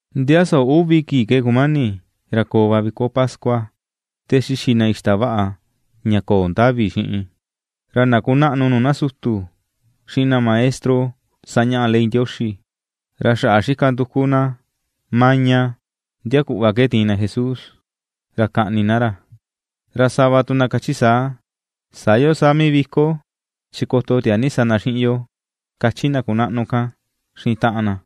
Ndia soo uvi kii ke kumani ra koo va viko pascua, te xixi na ixtavaꞌa ña köo ndavi xiꞌin. Ra na kunaꞌnu nuu na sutu xiꞌin na maestro sañaꞌa ley Ndioxi, ra xaꞌa na xika nduku na maña ndia kuꞌva ke tiin na Jesús, ra kaꞌni na ra. Ra sava tu na kachi saa: ―Sä yo saa mii viko, chi koto tiaa ni sa na yuvi xiꞌin yo ―kachi na kunaꞌnu kan xiꞌin taꞌan na.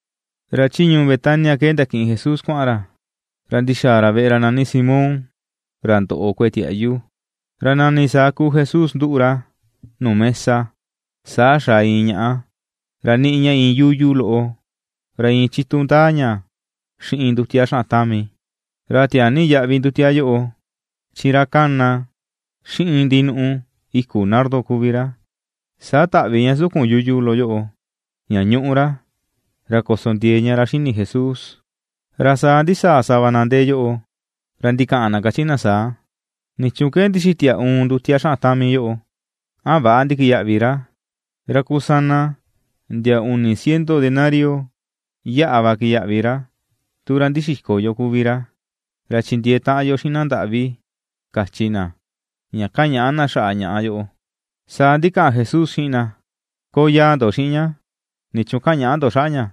Ra chi ñuu Betania ke ndakiꞌin Jesús kuaꞌan ra, ra ndi̱xa̱a̱ ra veꞌe ra nani Simón, ra ndoꞌo kueꞌe tiaꞌyu. Ra nani saa kuu Jesús ^nduꞌu ra nuu mesa, saa xaa iin ñaꞌa, ra niꞌi ña iin yuyu loꞌo ra iin chitu ndaa ña xiꞌin ndutia ra xaꞌan tami, ra tiaa ni yaꞌvi ndutia yoꞌo, chi ra kana xiꞌin ndinuꞌu i̱ku̱ nardo kuvi ra. Saa taꞌvi ña sukun yuyu loꞌo, ña ñuꞌu ra, ra ko̱so ndiee ña ra xi̱ni̱ Jesús. Ra saa ndisaa sava na ndee yoꞌo, ra ndikaꞌan na kachi na saa: ―¿Nichuun ke ndixitia uun ndu̱tia xaꞌan tami yoꞌo? A väꞌa ndikiyaꞌvi ra. Ra kusana ndia uni ciento denario yaꞌa va ki̱yaꞌvi̱ ra tu ra ndixiko yo kuvi ra; ra chindiee taꞌan yo xiꞌin na ndaꞌvi ―kachi na ña kañaꞌa na xaꞌa ñaꞌa yoꞌo. Saa ndikaꞌan Jesús xiꞌin na: ―Koyaa ndo xiꞌin ña. ¿Nichuun kañaꞌa ndo xaꞌa ña?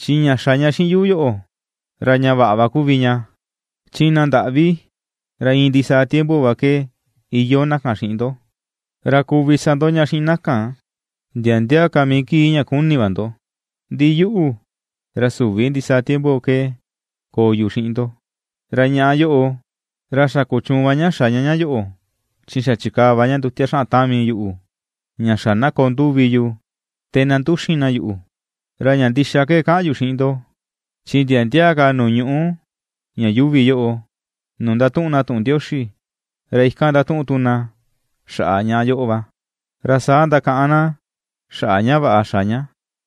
Chi ña xa ña xiꞌin yu yoꞌo, ra ña vaꞌa va kuvi ña. Chi na ndaꞌvi, ra iin ndisaa tiempo va ke iyoo na kan xiꞌin ndo, ra kuvi sa ndo ña vaꞌa xiꞌin na kan ndia ndia ka mii kii ña kuni̱ va ndo; ndi yuꞌu, ra süvi ndisaa tiempo ke koo yu xiꞌin ndo. Ra ñaꞌa yoꞌo, ra xa kuchuun va ña xa ña ña yoꞌo chi xa chikaa va ña ndutia ra xaꞌan tami yuꞌu, ña xa na koo nduvi yu te na nduxin na yuꞌu. Ra ña ndixa ke kaꞌan yu xiꞌin ndo, chi ndia ndia ka nuu ñuꞌu ña yuuvi yoꞌo, nuu ndatuꞌun na tuꞌun Ndioxi, ra ikan ndatuꞌun tu na xaꞌa ñaꞌa yoꞌo va, ra saa ndakaꞌan na xaꞌa ña vaꞌa xa ña.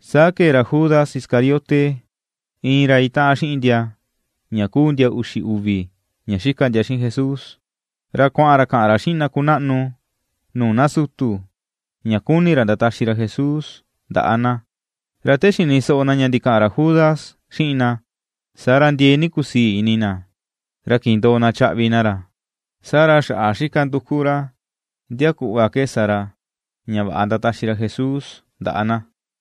Saa kee ra Judas Iscariote, iin ra itaꞌan xiꞌin ndia ña kuu ndia uxi uvi ña xika ndia xiꞌin Jesús, ra kuaꞌan ra kaꞌan ra xiꞌin na kunaꞌnu nuu na sutu ña kuni ra ndataxi ra Jesús ndaꞌa na. Ra te xini soꞌo na ña ndikaꞌan ra Judas xiꞌin na, saa ra ndiee ni kusii ini na, ra kindoo na chaꞌvi na ra, saa ra xaꞌa xika nduku ra ndia kuꞌva ke sa ra ña vaꞌa ndataxi ra Jesús ndaꞌa na.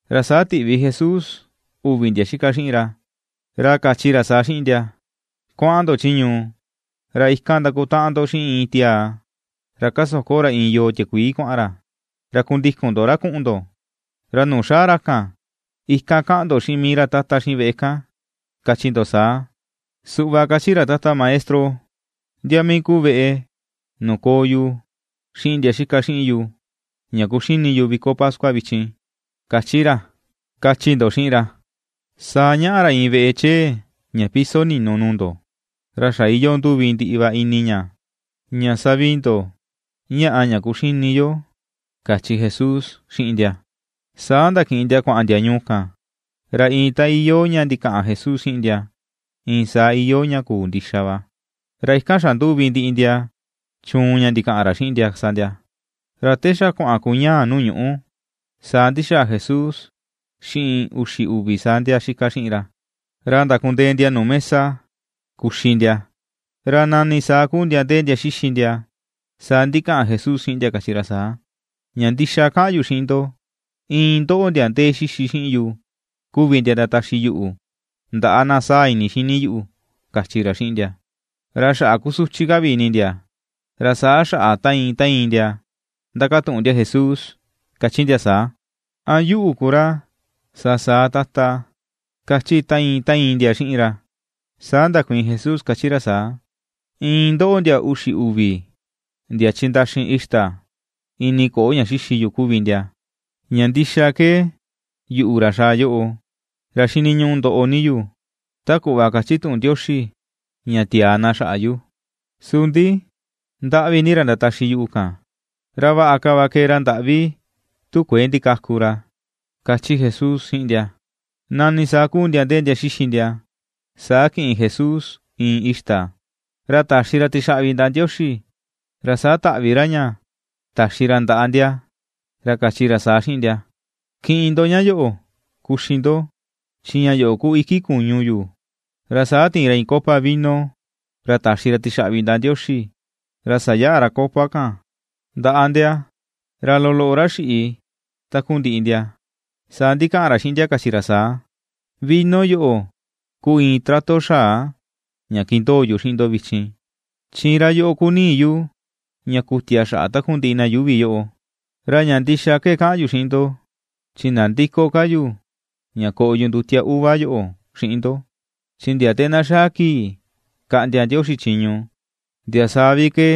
Ra saa tiꞌvi Jesús uvi ndia xika xiꞌin ra, ra kachi ra saa xiꞌin ndia: ―Kuaꞌan ndo chi ñuu. Ra ikan ndakutaꞌan ndo xiꞌin iin tiaa, ra kasoko ra iin yoo tiakuii kuaꞌan ra, ra kundikun ndo ra kuꞌun ndo. Ra nuu xaa ra kan, ikan kaꞌan ndo xiꞌin mii ra tata xiꞌin veꞌe kan kachi ndo saa: “Suꞌva kachi ra Tata Maestro: ¿Ndia mii ku veꞌe nuu koo yu xiꞌin ndia xika xiꞌin yu ña kuxini yu viko pascua vichin? kachi ra”, kachi ndo xiꞌin ra. Saa ñaꞌa ra iin veꞌe chee ña piso ni̱nù nuu ndo ra xa iyoo nduvi ndiꞌi va ini ña. Ñaa savii ndo ñaꞌa ña kuxini yo ―kachi Jesús xiꞌin ndia. Saa ndakiꞌin ndia kuaꞌan ndia ñuu kan. Ra iin ta iyoo ña ndikaꞌan Jesús xiꞌin ndia, iin saa iyoo ña kuu ndixa va, ra ikan xanduvi ndiꞌi ndia chuun ña ndikaꞌan ra xiꞌin ndia sa ndia. Ra te xa kuaꞌan kuñaà nuu ñuꞌu saa ndi̱xàà Jesús xiꞌin uxi uvi saa ndia xika xiꞌin ra. Ra ndakundee ndia nuu mesa kuxi ndia, ra nani saa kuu ndia ndee ndia xixi ndia, saa ndikaꞌan Jesús xiꞌin ndia kachi ra saa: ―Ña ndixa kaꞌan yu xiꞌin ndo, iin ndóꞌo̱ ndia ndee xixi xiꞌin yu kuvi ndia ndataxi yuꞌu ndaꞌa na saa ini xini yuꞌu ―kachi ra xiꞌin ndia. Ra xaꞌa kusuchi ka vi ini ndia, ra saa xaꞌa ta iin ta iin ndia ndakatuꞌun ndia Jesús kachi ndia saa: ―¿A yuꞌu ku ra sa saa, Tata? ―kachi ta iin ta iin ndia xiꞌin ra. Saa ndakuiin Jesús kachi ra saa: ―Iin ndoꞌo, ndia uxi uvi, ndia chindaxi ixta ini koꞌo ña xixi yu kuvi ndia. Ña ndixa ke yuꞌu, ra xaa yoꞌo, ra xiniñuꞌu ndoꞌo ni yu ta kuꞌva kachi tuꞌun Ndioxi ña tiaa na xaꞌa yu; su ndi ¡Ndaꞌvi ni ra ndataxi yuꞌu kan! Ra vaꞌa ka va kee ra ndaꞌvi tu kuëe ndikaku ra ―kachi Jesús xiꞌin ndia. Nani saa ku ndia ndee ndia xixi ndia, saa kiꞌin Jesús iin ixta, ra taxi ra tixaꞌvi ndaꞌa Ndioxi, ra saa taꞌvi ra ña taxi ra ndaꞌa ndia, ra kachi ra saa xiꞌin ndia: ―Kiꞌin ndo ña yoꞌo, kuxi ndo; chi ña yoꞌo ku iki kuñu yu ―kachi ra. Ra saa ti̱in ra iin copa vino, ra taxi ra tixaꞌvi ndaꞌa Ndioxi, ra sayaꞌa ra copa kan ndaꞌa ndia, ra loloꞌo ra xiꞌi takundiꞌi ndia. Saa ndikaꞌan ra xiꞌin ndia kachi ra saa: ―Vino yoꞌo ku iin trato xaa ña kindoo yu xiꞌin ndo vichin, chi ra yoꞌo ku ni̱i̱ yu ña ku̱tia xaꞌa takundiꞌi na yuuvi yoꞌo. Ra ña ndixa ke kaꞌan yu xiꞌin ndo chi ndandïko ka yu ña koꞌo yu ndutia uva yoꞌo xiꞌin ndo; chi ndia te na xaa kii kaꞌndia Ndioxi chiñu, ndia saa vi ke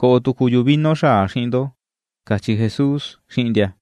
koꞌo tuku yu vino xaa xiꞌin ndo ―kachi Jesús xiꞌin ndia.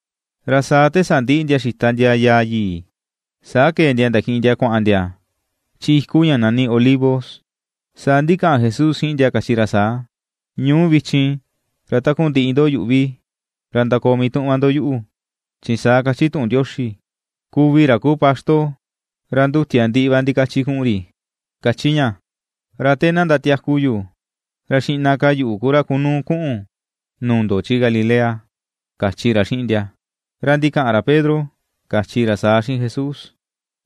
Ra saa te sandiꞌi ndia xita ndia yaa yii, saa ke̱e ndia ndakiꞌin ndia kuaꞌan ndia chi iku ña nani Olivo. Saa ndikaꞌan Jesús xiꞌin ndia kachi ra saa: ―Ñuu vichin ra takundiꞌi ndo yuꞌvi, ra ndakoo mii tuꞌun va ndo yuꞌu; chi saa kachi tuꞌun Ndioxi: “Kuvi ra kuu paxto, ra ndutia ndiꞌi va ndikachi kuꞌun ri”, kachi ña. Ra te na ndatiaku yu, ra xiꞌna ka yuꞌu ku ra kunuu kuꞌun nuu ndo chi Galilea ―kachi ra xiꞌin ndia. Ra ndikaꞌan ra Pedro kachi ra saa xiꞌin Jesús: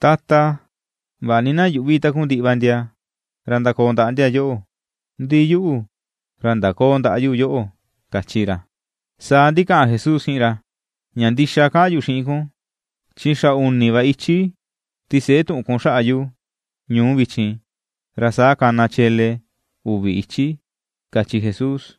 ―Tata, vaꞌa ni na yuꞌvi takundiꞌi va ndia ra ndakoo ndia yoꞌo, ndi yuꞌu, ra ndaköo ndaꞌa yu yoꞌo ―kachi ra. Saa ndikaꞌan Jesús xiꞌin ra: ―Ña ndixa kaꞌan yu xiꞌin kun, chi xa uni va ichi ti̱se̱ꞌe tuꞌun kun xaꞌa yu ñu̱u vichin, ra saa kana chele uvi ichi ―kachi Jesús.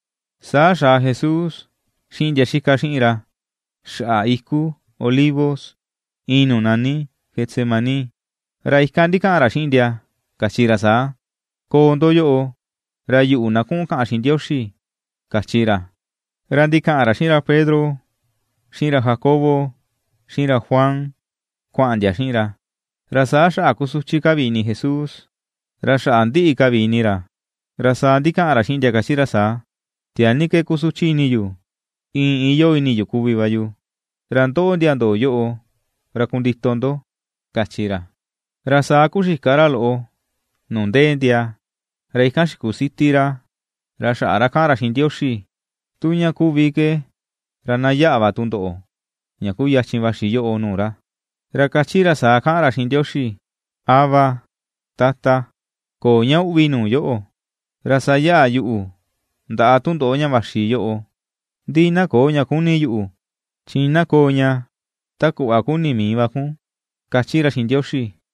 Saa xaa Jesús xiꞌin ndia xika xiꞌin ra xaꞌa iku Olivo iin nuu nani Getsemaní, ra ikan ndikaꞌan ra xiꞌin ndia, kachi ra saa: ―Koo ndo yoꞌo, ra yuꞌu, na kuꞌun kaꞌan xiꞌin Ndioxi ―kachi ra. Ra ndikaꞌan ra xiꞌin ra Pedro, xiꞌin ra Jacobo, xiꞌin ra Juan, kuaꞌan ndia xiꞌin ra. Ra saa xaꞌa kusuchi ka vi ini Jesús ra xaꞌa ndiꞌi ka vi ini ra. Ra saa ndikaꞌan ra xiꞌin ndia kachi ra saa: ―Tiaa ni ke kusuchi ini yu, iin iyoo ini yu kuvi va yu; ra ndoꞌo, ndia ndòò yoꞌo ra kundito ndo ―kachi ra. Ra saa kuxika ra loꞌo nuu ndee ndia, ra ikan xikusiti ra, ra xaꞌa ra kaꞌan ra xiꞌin Ndioxi, tu ña kuvi ke ra na yaꞌa va tundoꞌo ña kuyachin vaxi yoꞌo nuu ra. Ra kachi ra saa kaꞌan ra xiꞌin Ndioxi: ―Abba Tata, köo ña uꞌvi nuu yóꞌo̱. Ra sayaꞌa yuꞌu ndaꞌa tundoꞌo ña vaxi yo̱ꞌo̱; ndi na köo ña kuni yuꞌu, chi na koo ña ta kuꞌva kuni mii va kun ―kachi ra xiꞌin Ndioxi.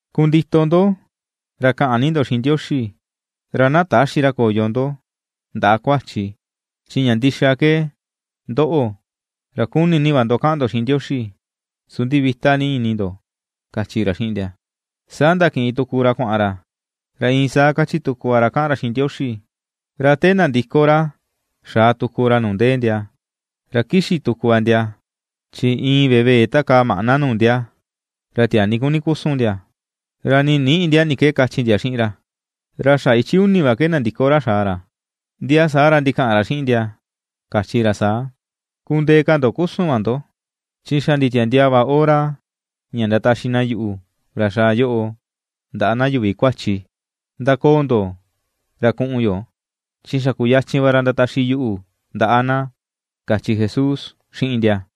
Kundito ndo, ra kaꞌan ni ndo xiꞌin Ndioxi, ra na täxi ra ña koyo ndo ndaꞌa kuachi; chi ña ndixa ke: ndoꞌo, ra kuni ni va ndo kaꞌan ndo xiꞌin Ndioxi, su ndi vita ni ini ndo ―kachi ra xiꞌin ndia. Saa ndakiꞌin tuku ra kuaꞌan ra, ra iin saa kachi tuku va ra kaꞌan ra xiꞌin Ndioxi. Ra te nandiko ra, xaa tuku ra nuu ndee ndia, ra kixi tuku va ndia, chi iin vevee takaa maꞌna nuu ndia ra tiaa ni kuni kusu ndia, ra nii ninïꞌi ndia ni ke kachi ndia xiꞌin ra. Ra xa ichi uni va ke nandiko ra xaa ra, ndia saa ra ndikaꞌan ra xiꞌin ndia, kachi ra saa: ―¡Kundee ka ndo kusu va ndo! Chi xa nditiandiaa va hora ña ndataxi na yuꞌu, ra xaa yoꞌo, ndaꞌa na yuvi kuachi. Ndakoò ndo ra kuꞌun yo; chi xa kuyachin va ra ndataxi yuꞌu ndaꞌa na ―kachi Jesús xiꞌin ndia.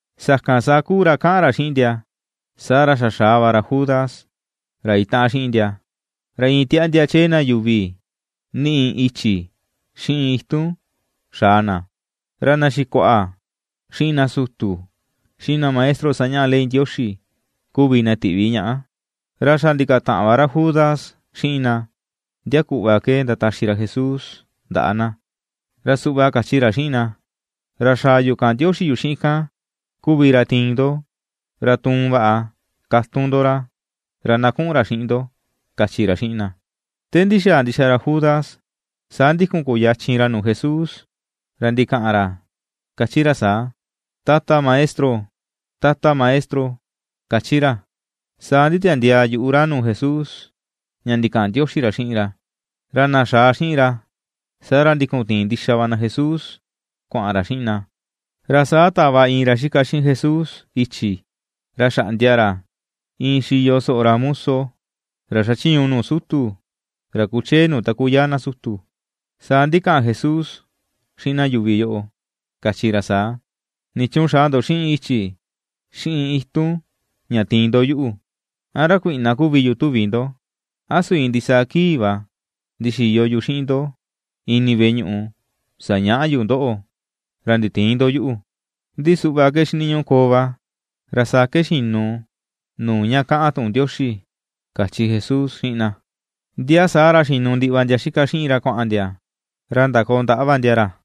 Sakan saa kuu ra kaꞌan ra xiꞌin ndia, saa ra xa xaa va ra Judas, ra itaꞌan xiꞌin ndia, ra iin tiaꞌndia chee na yuvi niꞌi i̱chi̱ xiꞌin itun xaa na; ra na xikuaꞌa, xiꞌin na sutu, xiꞌin na maestro sañaꞌa ley Ndioxi kuvi na tiꞌvi ñaꞌa. Ra xa ndikataꞌan va ra Judas xiꞌin na ndia kuꞌva ke ndataxi ra Jesús ndaꞌa na. Ra suꞌva kachi ra xiꞌin na: ―Ra xaa yu kaꞌan ndioxi yu xiꞌin kan kuvi ra tiin ndo, ra tuun vaꞌa katun ndo ra, ra na kuꞌun ra xiꞌin ndo ―kachi ra xiꞌin na. Te ndi̱xàà ndixa ra Judas, saa ndikun kuyachin ra nuu Jesús ra ndikaꞌan ra kachi ra saa: ―¡Tata Maestro! ¡Tata Maestro! kachi ra. Saa nditiandiaa yuꞌu ra nuu Jesús, ña ndikaꞌan ndioxi ra xiꞌin ra. Ra na xaa xiꞌin ra, saa ra ndikun tiin ndixa va na Jesús kuaꞌan ra xiꞌin na. Ra saa tava iin ra xika xiꞌin Jesús i̱chi̱, ra xaꞌndia ra iin xiyo soꞌo ra muso ra xachiñu nuu sutu ra kuchee nuu taku yaa na sutu. Saa ndikaꞌan Jesús xiꞌin na yuvi yoꞌo, kachi ra saa: ―¿Nichuun xaa ndo xiꞌin i̱chi̱, xiꞌin itun ña tiin ndo yuꞌu? ¿A ra kuiꞌna kuvi yu tuvi ndo? A su iin ndisaa kii va ndixiyo yu xiꞌin ndo ini veꞌe ñuꞌu, sañaꞌa yu ndóꞌo̱, ra nditïin ndo yuꞌu. Ndi suꞌva ke xiniñuꞌu koo va, ra saa ke xinu nuu ña kaꞌan tuꞌun Ndioxi ―kachi Jesús xiꞌin na. Ndia saa ra xinu ndiꞌi va ndia xika xiꞌin ra kuaꞌan ndia ra ndakoo ndaꞌa va ndia ra.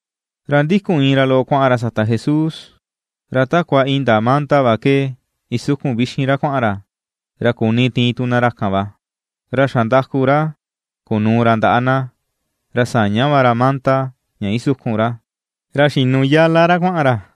Ra ndikun iin ra loꞌo kuaꞌan ra sata Jesús, ra takua indaa manda va ke isukun vixin ra kuaꞌan ra, ra kuni tiin tu na ra kan va. Ra xandaku ra kunuu ra ndaꞌa na, ra saña va ra manda ña isukun ra, ra xinu yala ra kuaꞌan ra.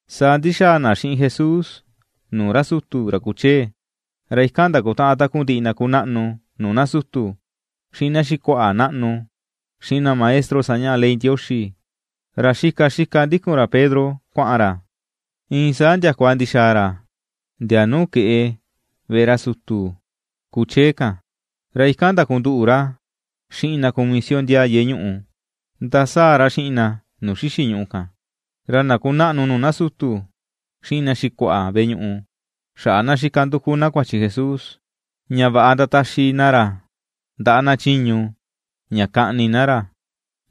Saa ndi̱xa̱a̱ na xiꞌin Jesús nuu ra sutu, ra kuchee, ra ikan ndakutaꞌan takundiꞌi na kunaꞌnu nuu na sutu, xiꞌin na xikuaꞌa naꞌnu, xiꞌin na maestro sañaꞌa ley Ndioxi. Ra xika xika ^ndíku̱n ra Pedro kuaꞌan ra, iin saa ndiakua ndixaa ra ndia nuu keꞌe veꞌe ra sutu kuchee kan, ra ikan ndakunduꞌu ra xiꞌin na kumisio ndiaa yeꞌe ñuꞌu, ndasaa ra xiꞌin na nuu xixi̱ ñùꞌù kan. Ra na kunaꞌnu nuu na sutu xiꞌin na xikuaꞌa veꞌe ñuꞌu, xaꞌa na xika nduku na kuachi Jesús, ña vaꞌa ndataxi na ra ndaꞌa na chiñu ña kaꞌni na ra,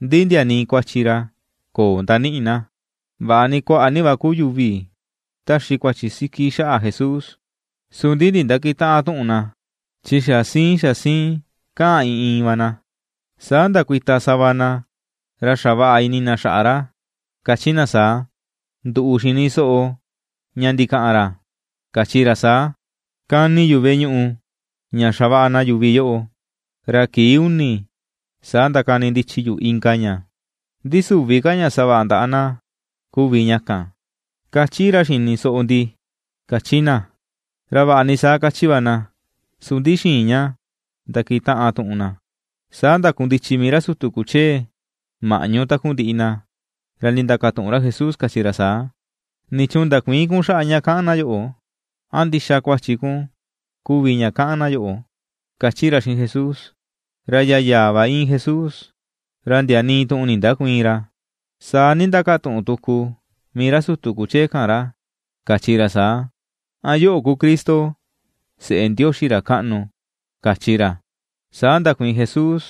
ndi ndia nii kuachi ra köo ndaniꞌi na. Vaꞌa ni kuaꞌa ni va ku yuvi taxi kuachi siki xaꞌa Jesús, su ndi ndindäkitaꞌan tuꞌun na, chi xa siin xa siin kaꞌan iin iin va na. Saa ndakuita sava na ra xavaꞌa ini na xaꞌa ra, kachi na saa: ―Nduꞌu xini soꞌo ña ndikaꞌan ra kachi ra saa: “Kani yu veꞌe ñuꞌu ña xavaꞌa na yuvi yoꞌo, ra kii uni saa ndakanindichi yu inka ña, ndi süvi ka ña savaꞌa ndaꞌa na kuvi ña kan”, kachi ra xini soꞌo ndi ―kachi na. Ra vaꞌa ni saa kachi va na, su ndi xïin ña ndakitaꞌan tuꞌun na. Saa ndakundichi mii ra sutu kuchee maꞌñu takundiꞌi na, ra ndindakatuꞌun ra Jesús kachi ra saa: ―¿Nichuun ndakuïin kun xaꞌa ña kaꞌan na yoꞌo? ¿A ndixa kuachi kun kuvi ña kaꞌan na yoꞌo? ―kachi ra xiꞌin Jesús. Ra yayaa va íin Jesús ra ndia nii tuꞌun ndindäkuiin ra. Saa ndindakatuꞌun tuku mii ra sutu kuchee kan ra, kachi ra saa: ―¿A yoꞌo ku Cristo, seꞌe Ndioxi ra kaꞌnu? ―kachi ra. Saa ndakuiin Jesús,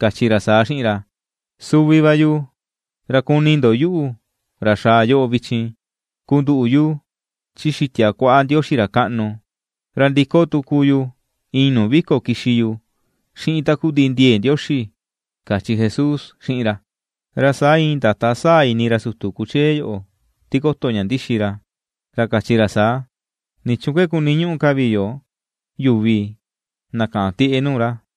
kachi ra saa xiꞌin ra: ―Suvi va yu. Ra kuni ndo yuꞌu, ra xaa yoꞌo vichin, kunduꞌu yu chi xitia kuaꞌa Ndioxi ra kaꞌnu, ra ndiko tuku yu iin nuu vi̱ko̱ kixi yu xiꞌin takundiꞌi ndie̱e̱ Ndioxi ―kachi Jesús xiꞌin ra. Ra saa iin ndata saa ini ra sutu kuchee yoꞌo tikoto ña ndixi ra, ra kachi ra saa: ―¿Nichuun ke kuniñuꞌu ka vi yo yuvi na kaꞌan tieꞌe nuu ra?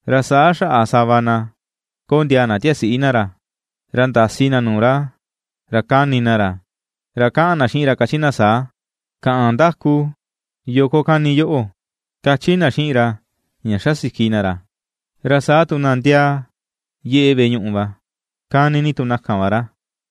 Ra saa xaꞌa sava na kondiaa na tiasiꞌi na ra. Ra ndasi na nuu ra, ra kani na ra, ra kaꞌan na xiꞌin ra kachi na saa: ―¡Kaꞌan ndaku! ¿Yoo ko kani yoꞌo? ―kachi na xiꞌin ra ña xasiki na ra. Ra saa tu na ndiaa yeꞌe veꞌe ñuꞌu va, kani ni tu na kan va ra.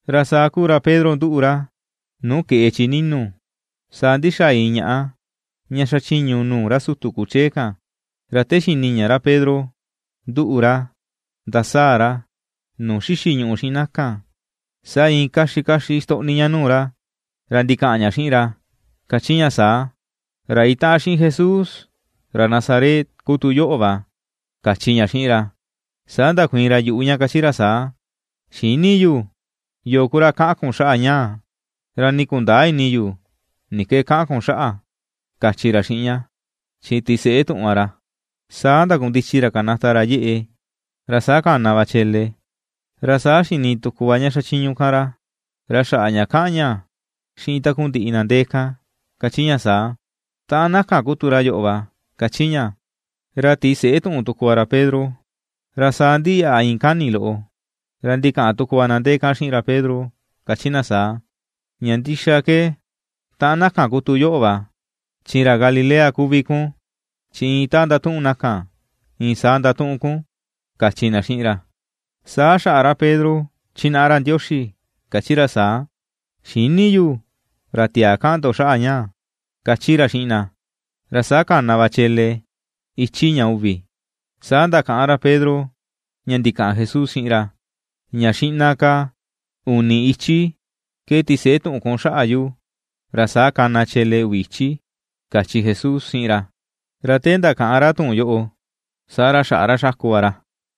Ra saa kuu ra Pedro nduꞌu ra nuu keꞌe chi ni̱nu̱, saa ndi̱xàà iin ñaꞌa ña xachiñu nuu ra sutu kuchee kan. Ra te xini ña ra Pedro nduꞌu ra ndasaa ra nuu xixi ñùꞌù xiꞌin na kan, saa iin kaxi kaxi ixtoꞌni ña nuu ra, ra ndikaꞌan ña xiꞌin ra, kachi ña saa: ―Ra itaꞌan xiꞌin Jesús ra Nazaret ku tu yoꞌo va ―kachi ña xiꞌin ra. Saa ndakuiin ra yuꞌu ña, kachi ra saa: ―Xïni yu yo̱o̱ ku ra kaꞌan kun xaꞌa ñaa, ra nii kundäa ini yu ni ke kaꞌan kun xaꞌa ―kachi ra xiꞌin ña, chi ti̱se̱ꞌe tuꞌun va ra. Saa ndakundichi ra kanata ra yeꞌe, ra saa kana va chele. Ra saa xini tuku va ña xachiñu kan ra, ra xaꞌa ña kaꞌan ña xiꞌin takundiꞌi na ndee kan, kachi ña saa: ―Taꞌan na kan ku tu ra yoꞌo va ―kachi ña. Ra ti̱se̱ꞌe tuꞌun tuku va ra Pedro. Ra saa ndiyaꞌa iin kani loꞌo, ra ndikaꞌan tuku va na ndee kan xiꞌin ra Pedro, kachi na saa: ―Ña ndixa ke taꞌan na kan ku tu yoꞌo va, chi ra Galilea kuvi kun, chi iin ta ndatuꞌun na kan iin saa ndatuꞌun kun ―kachi na xiꞌin ra. Saa xaꞌa ra Pedro chinaꞌa ra Ndioxi, kachi ra saa: ―¡Xïni yu ra tiaa kaꞌan ndo xaꞌa ñaa! ―kachi ra xiꞌin na. Ra saa kana va chele ichi ña uvi. Saa ndakaꞌan ra Pedro ña ndikaꞌan Jesús xiꞌin ra: ña “Xiꞌna ka uni ichi ke tiseꞌe tuꞌun kun xaꞌa yu, ra saa kana chele uvi ichi”, kachi Jesús xiꞌin ra. Ra te ndakaꞌan ra tuꞌun yoꞌo, saa ra xaꞌa ra xaku va ra.